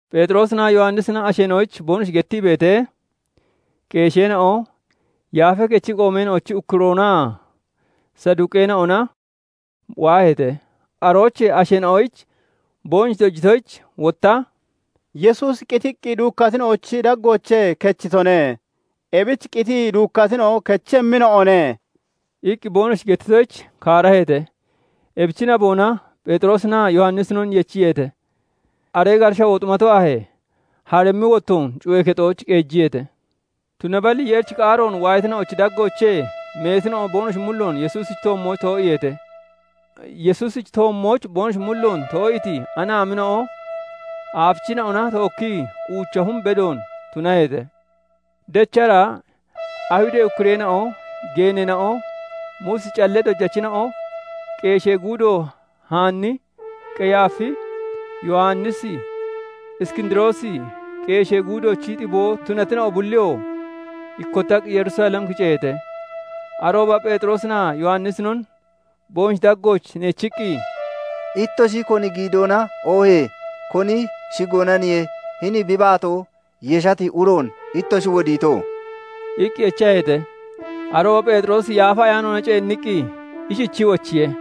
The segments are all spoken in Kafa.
Pheexiroosinaa Yowannisina asheena'oyich boonoshi gettii beetee, qeesheena'o, Yaafee Kechi qoomeena'ochi ukkuroonaa Saduqeena'ona waaheete. Aroochee asheena'oyich boonoshi dojitoyich, wotta "Yesuusi qitii duukkatina'ochi daggoochee kechitone; ebich qitii duukkatina'o kechemmina'o ne" iqqi boonoshi gettitoyich, kaaraheete. Ebichi naboona Pheexiroosinaa Yowannisinon yechiyeete; aree gaata shawoo xumato aahee, harimmi wottoon cuyee kexooch qeejiyeete. Tunaballi Yeerichi qaaroon waayatina'ochi daggoochee meetina'o boonoshi mulloon Yesuusichi toommooch too'iiheete. Yesuusichi toommooch boonoshi mulloon too'iiti anaamina'o aafichina'ona tookkii uucha hum bedoon tunaheete. Dechara Ayihudee ukkureena'o, geeneena'o, Muusichi callee dojachina'o, qeeshee guudo Haanni, Qeyaafi, Yowannisi, Iskindiroosi, qeeshee guudoochi xiboo tunatina'o bulliyoo ikkottaqqi Yerusalem kiceeheete. Arooba Pheexiroosinaa Yowannisinon boonoshi daggooch neechiqqi, "Ittoshi koni giidoona oohee koni shigoonaniye hini bi baatoo yeshati uroon ittoshi wodiito?" iqqi echaheete. Arooba Pheexiroosi Yaafa Ayaanoona ceenniqqi ishichii wochiye:-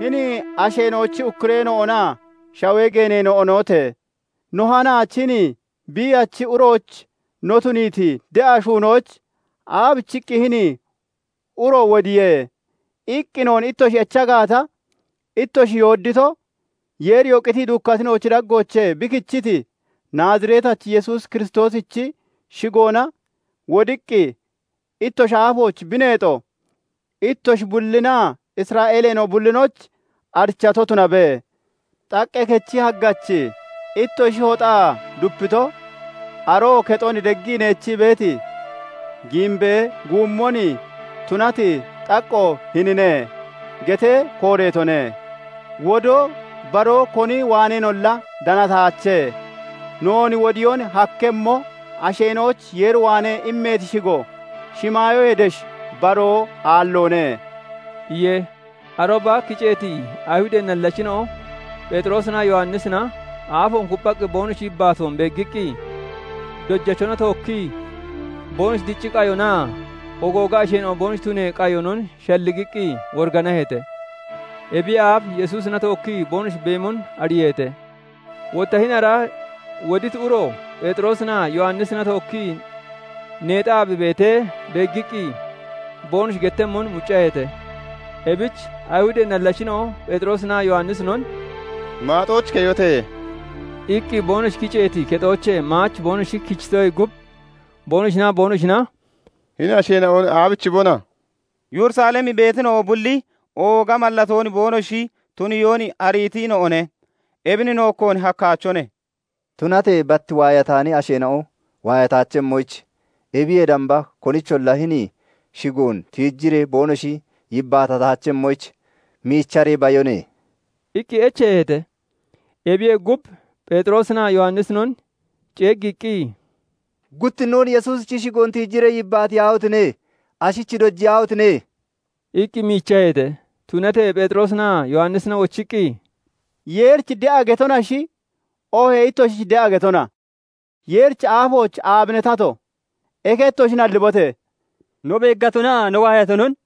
"Hini asheena'ochi ukkureena'onaa shawee geeneena'onote! No hanaach hini biiyachi uroyich no tuniiti de'a shuunoyich 'Aabichiqqi hini uro wodiye?' iqqi noon ittoshi echa gaata, ittoshi yooddiito, Yeeriyoo qitii duukkatina'ochi daggoochee bi kichiti, Naaziretachi Yesuus Kiristoosichi shigoona wodiqqi ittoshi aafooch bi neexo ittoshi bullinaa Isra'eeleena'o bullinoyich arichato tunabe. 'Xaqqee kechi haggachi ittoshi hoxaa dupito, Aroo kexon deggii neechii beeti, giimbee guummon tunati xaqqoo hinine' getee kooreetone. Wodoo baroo koni waaneenolla danataache; noon wodiyoon hakkemmo, asheena'oyich Yeer waanee immati shigo shimaayoyee desh baroo aalloone" iye. Arooba kiceeti Ayihudee nallachina'o Pheexiroosinaa Yowannisina aafoon kupphaqqi boonoshi yibbaatoon beeggiqqi, dojachona tookkii boonoshi dicci qayonaa ogooga asheena'o boonoshi tunee qayonon shalligiqqi woriganaheete; ebiyee aaf Yesuusina tookkii boonoshi beemon ariiheete. Wotta hini ara woditi uro Pheexiroosinaa Yowannisina tookkii neexaa bi beetee beeggiqqi, boonoshi gettemmon muccaheete. Ebich Ayihudee nallachina'o Pheexiroosinaa Yowannisinon "Maaxooch keyote!" iqqi boonoshi kiceeti kexoochee maach boonoshi kichitoyee gub, boonoshinaa boonoshina "Hini asheena'on aabichibona? Yerusalem beetina'o bulli ooga mallatoon boonoshi tuniyoon ariitina'one. Ebin nookkoon hakkaachone. Tunatee bat waayataani asheena'o waayataachemmoyich, ebiyee damba konicholla hini shigoon tiijiree boonoshi yibbaatataachemmoyich, miicharee bayone" iqqi echeeheete. Ebiyee gub, Pheexiroosinaa Yowannisinon ceeggiiqqi, "Guttinnoon Yesuusichi shigoon tiijiree yibbaatiyaahotine! Ashich dojiyaahotine!" iqqi miichaheete. Tunatee Pheexiroosinaa Yowannisina wochiqqi, "Yeerich de'a getonashi, oohee ittoshich de'a getona? Yeerichi aafooch aabine tato? Eke ittoshi nallibote! No beeggatonaa no waayatonon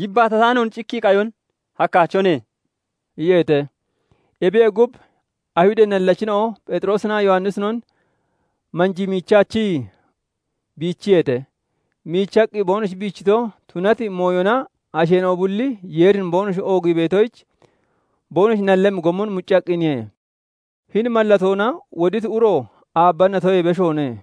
yibbaatataanoon cikkii qayon hakkaachone" iyeete. Ebiyee gub, Ayihudee nallachina'o Pheexiroosinaa Yowannisinon manjii miichaachii biichiyeete. Miichaqqi boonoshi biichito, tunati mooyona asheena'o bulli Yeerin boonoshi oogii beetoyich, boonoshi nallemmi gommon muccaqqiniye. Hini mallatoona woditi uro aabba natoyee beshoone.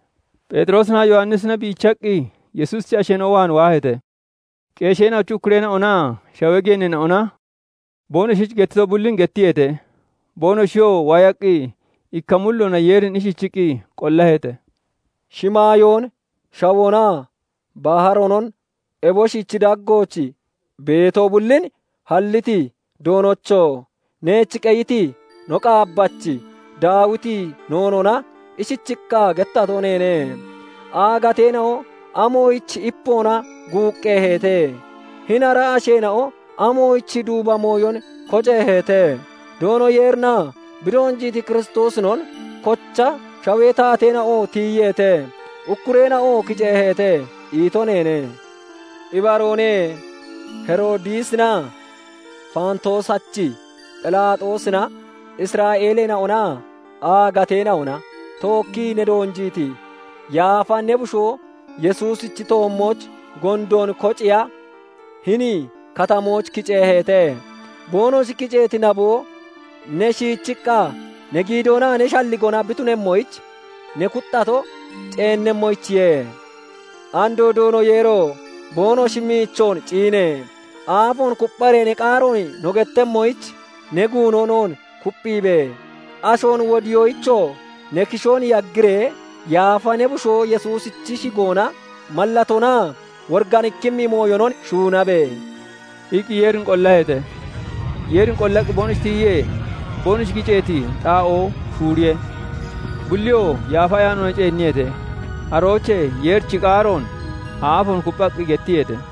Pheexiroosinaa Yowannisina biichaqqi Yesuusichi asheena'o waan waaheete. Qeesheena'ochi ukkureena'onaa shawee geeneena'ona boonoshich gettito bullin gettiyeete. Boonoshiyoo waayaqqi, ikka mulloona Yeerin ishichiqqi qollaheete:- "Shimaayoon, shawoonaa baharoonon, eboshichi daggooch beeto bullin halliti Doonocho! Neech qeyiti no qaabbachi Daawiti noonoona ishichiqqa gettato neene:- 'Aagateena'o amoyich ipoona guuqqeeheete? Hini ara asheena'o amoyich duuba mooyon koceeheete? Doono Yeerinaa bi doonjiiti Kiristoosinon kocha shawee taateena'o tiyiyeete; Ukkureena'oo kiceeheete' ito neene. "Ibaroone; Heroodisinaa Faantoosachi Phelaaxoosina Isra'eeleena'onaa aagateena'ona tookkii ne doonjiiti yaafa ne Bushoo Yesuusichi toommooch gondoon koceeya hini katamooch kiceeheete. Boonoshi kiceeti naboo, ne shiichiqqa ne giidoonaa ne shalligoona bi tunemmoyich ne kuxxato ceennemmoyichiye. Andoo Doono Yeero! Boonoshi miichoon ciine! Aafoon kuppharee ne qaaroon no gettemmoyich, ne guuno noon kupphiibe! Ashoon wodiyoyichoo ne kishoon yaggiree, yaafa ne Bushoo Yesuusichi shigoona mallatoonaa woriganikkimmi mooyonon shuunabe!" iqqi Yeerin qollaheete. Yeerin qollaqqi boonoshi tiyiyee, boonoshi kiceeti xaa'oo shuuriye. Bulliyoo Yaafa Ayaanoona ceenniyeete; aroochee Yeerichi qaaroon aafoon kupphaqqi gettiyeete.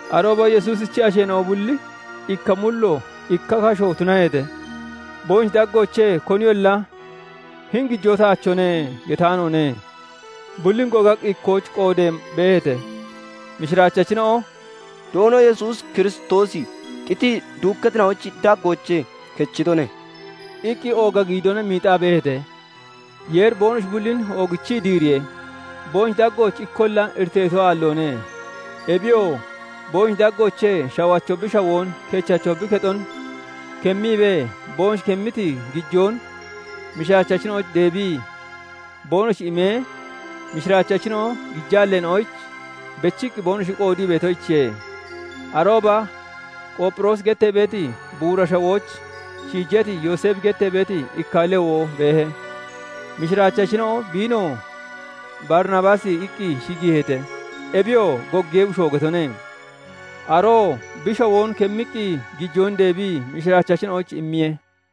Arooba Yesuusichi asheena'o bulli ikka mullo, ikka kasho tunaheete; boonoshi daggoochee koniyolla "Hini gijoo taachone" getaanoone; bullin gogaqqi ikkooch qoodee beeheete. Mishiraachachina'o "Doono Yesuus Kiristoosi qitii duukkatina'ochi daggoochee kechitone" iqqi ooga giidoona miixaa beeheete; Yeeri boonoshi bullin oogichii diiriye. Boonoshi daggooch ikkolla iriteeto aalloone; ebiyoo boonoshi daggoochee shawacho bi shawoon, kechacho bi kexon kemmiibee, boonoshi kemmiti gijoon mishiraachachina'oyich deebii boonoshi imee, mishiraachachina'o gijaalleena'oyich bechiqqi boonoshi qoodii beetoyichiye. Arooba Qoopphiroosi gettee beeti buura shawooch shiijati, Yooseefi gettee beeti ikka Lewo beehe. Mishiraachachina'o biinoo "Barinabaasi" iqqi shigiiheete; ebiyoo "Goggiyee bushoo" getone. Aroo bi shawoon kemmiqqi gijoon deebii mishiraachachina'oyich immiye.